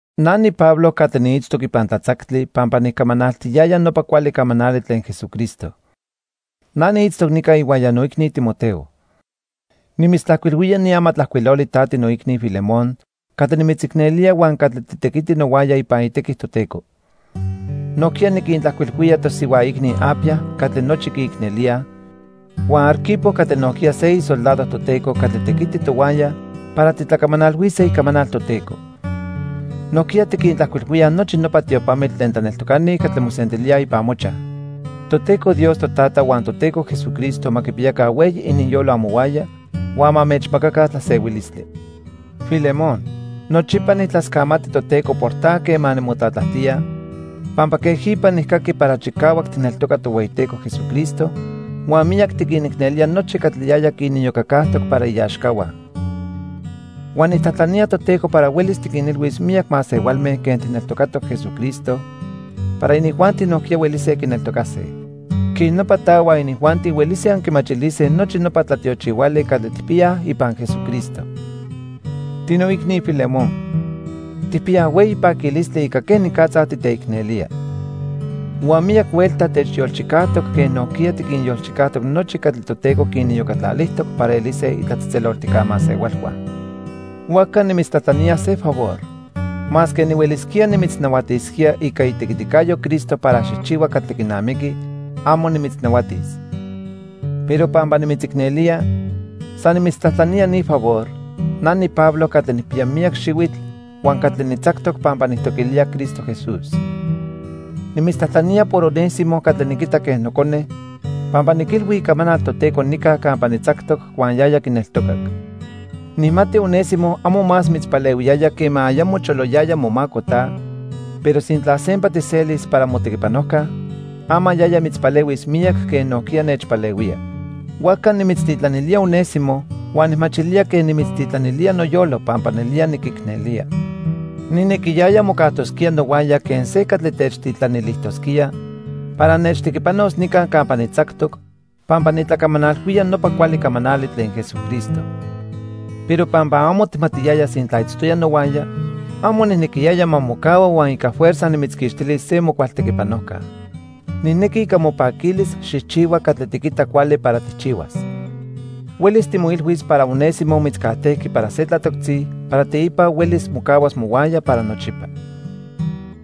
Na niPablo catli niitztoc ipan tlatzactli pampa nicamanaltiyaya nopa cuali camanali tlen Jesucristo. Na niitztoc nica ihuaya noicni Timoteo. Nimitztlajcuilhuía ni amatlajcuiloli ta tinoicni Filemón catli nimitzicnelía huan catli titequiti nohuaya ipan itequi Toteco. Nojquiya niquintlajcuilhuía tosihua icni Apia catli nochi quiicnelíaj, huan Arquipo catli nojquiya se isoldado Toteco catli tequiti tohuaya para titlacamanalhuise icamanal Toteco. Nojquiya tiquintlajcuilhuíaj nochi nopa tiopamitl tlen tlaneltocani catli mosentilíaj ipan mochaj. Toteco Dios Totata huan Toteco Jesucristo ma quipiyaca hueyi ininyolo amohuaya huan ma anmechmacaca tlasehuilistli. Filemón, nochipa nijtlascamati Toteco por ta quema nimotlatlajtía, pampa quejipa nijcaqui para chicahuac tijneltoca Tohueyiteco Jesucristo huan miyac tiquinicnelía nochi catli yaya quiniyocacajtoc para iaxcahua. Huan nijtlajtlanía Toteco para huelis tiquinilhuis miyac masehualme quen tijneltocatoc Jesucristo para inijuanti nojquiya huelise quineltocase. Quej nopa ta huan inijuanti huelise anquimachilise nochi nopa tlatiochihuali catli tijpiyaj ipan Jesucristo. Tinoicni Filemón, tijpiyaj hueyi paquilistli ica quenicatza titeicnelía. Huan miyac huelta techyolchicajtoc quen nojquiya tiquinyolchicajtoc nochi catli Toteco quiniyocatlalijtoc para elise itlatzejtzeloltijca masehualhua. Huajca nimitztlajtlanía se favor. Masque nihuelisquía nimitznahuatisquía ica itequiticayo Cristo para xijchihua catli quinamiqui, amo nimitznahuatis. Pero pampa nimitzicnelía, san nimitztlajtlanía ni favor, na niPablo catli nijpiya miyac xihuitl, huan catli nitzactoc pampa nijtoquilía Cristo Jesús. Nimitztlajtlanía por Onésimo catli niquita quen nocone pampa niquilhui icamanal Toteco nica campa nitzactoc huan yaya quineltocac. Nijmati Onésimo amo más mitzpalehuiyaya quema ayamo choloyaya momaco ta, pero sintla sempa tijselis para motequipanojca, ama yaya mitzpalehuis miyac quen nojquiya nechpalehuía. Huajca nimitztitlanilía Onésimo huan nijmachilía quen nimitztitlanilía noyolo pampa nelía niquicnelía. Nijnequiyaya mocajtosquía nohuaya quen se catli techtitlanilijtosquía para nechtequipanos nica campa nitzactoc pampa nitlacamanalhuía nopa cuali camanali tlen Jesucristo. Pero pampa amo tijmatiyaya sintla itztoya nohuaya, amo nijnequiyaya ma mocahua huan ica fuerza nimitzquixtilis se mocual tequipanojca. Nijnequi ica mopaquilis xijchihua catli tiquita cuali para tijchihuas. Huelis timoilhuis para Onésimo mitzcajtejqui para se tlatoctzi para teipa huelis mocahuas mohuaya para nochipa.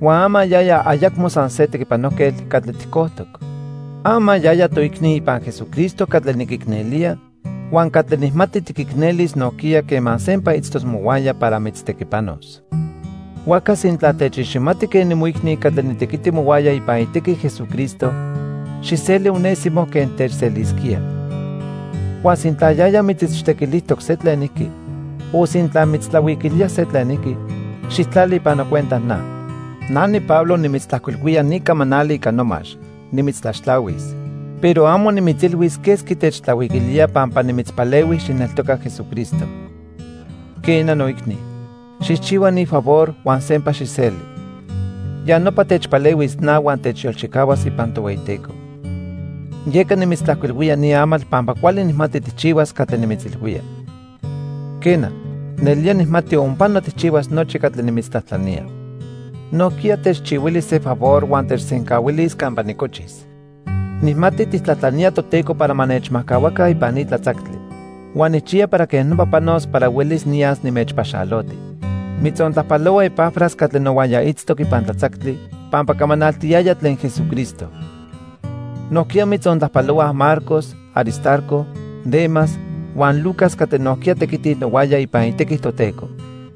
Huan ama yaya ayacmo san se tequipanojquetl catli tijcojtoc. Ama yaya toicni ipan Jesucristo catli niquicnelía huan catli nijmati tiquicnelis nojquiya quema sempa itztos mohuaya para mitztequipanos. Huajca sintla techiximati quen nimoicni catli nitequiti mohuaya ipan itequi Jesucristo, xijseli Onésimo quen techselisquía. Huan sintla yaya mitzichtequilijtoc se tlenijqui o sintla mitztlahuiquilía se tlenijqui, xijtlali ipan nocuenta na. Na niPablo nimitztlajcuilhuía ni camanali ica nomax: Nimitztlaxtlahuis. Pero amo nimitzilhuis quesqui techtlahuiquilía pampa nimitzpalehui xijneltoca Jesucristo. Quena noicni, xijchihua ni favor huan sempa xijseli. Ya nopa techpalehuis na huan techyolchicahuas ipan Tohueyiteco. Yeca nimitztlajcuilhuilía ni amatl pampa cuali nijmati tijchihuas catli nimitzilhuía. Quena, nelía nijmati onpano tijchihuas nochi catli nimitztlajtlanía. Nojquiya techchihuili se favor huan techsencahuilis campa nicochis. Nijmati tijtlajtlanía Toteco para ma nechmajcahuaca ipan ni tlatzactli. Huan nijchiya para quej nopa panos para huelis niyas nimechpaxaloti. Mitzontlajpalohua Epafras catli nohuaya itztoc ipan tlatzactli pampa camanaltiyaya tlen Jesucristo. Nojquiya mitzontlajpalohuaj Marcos, Aristarco, Demas huan Lucas catli nojquiya tequitij nohuaya ipan itequi Toteco.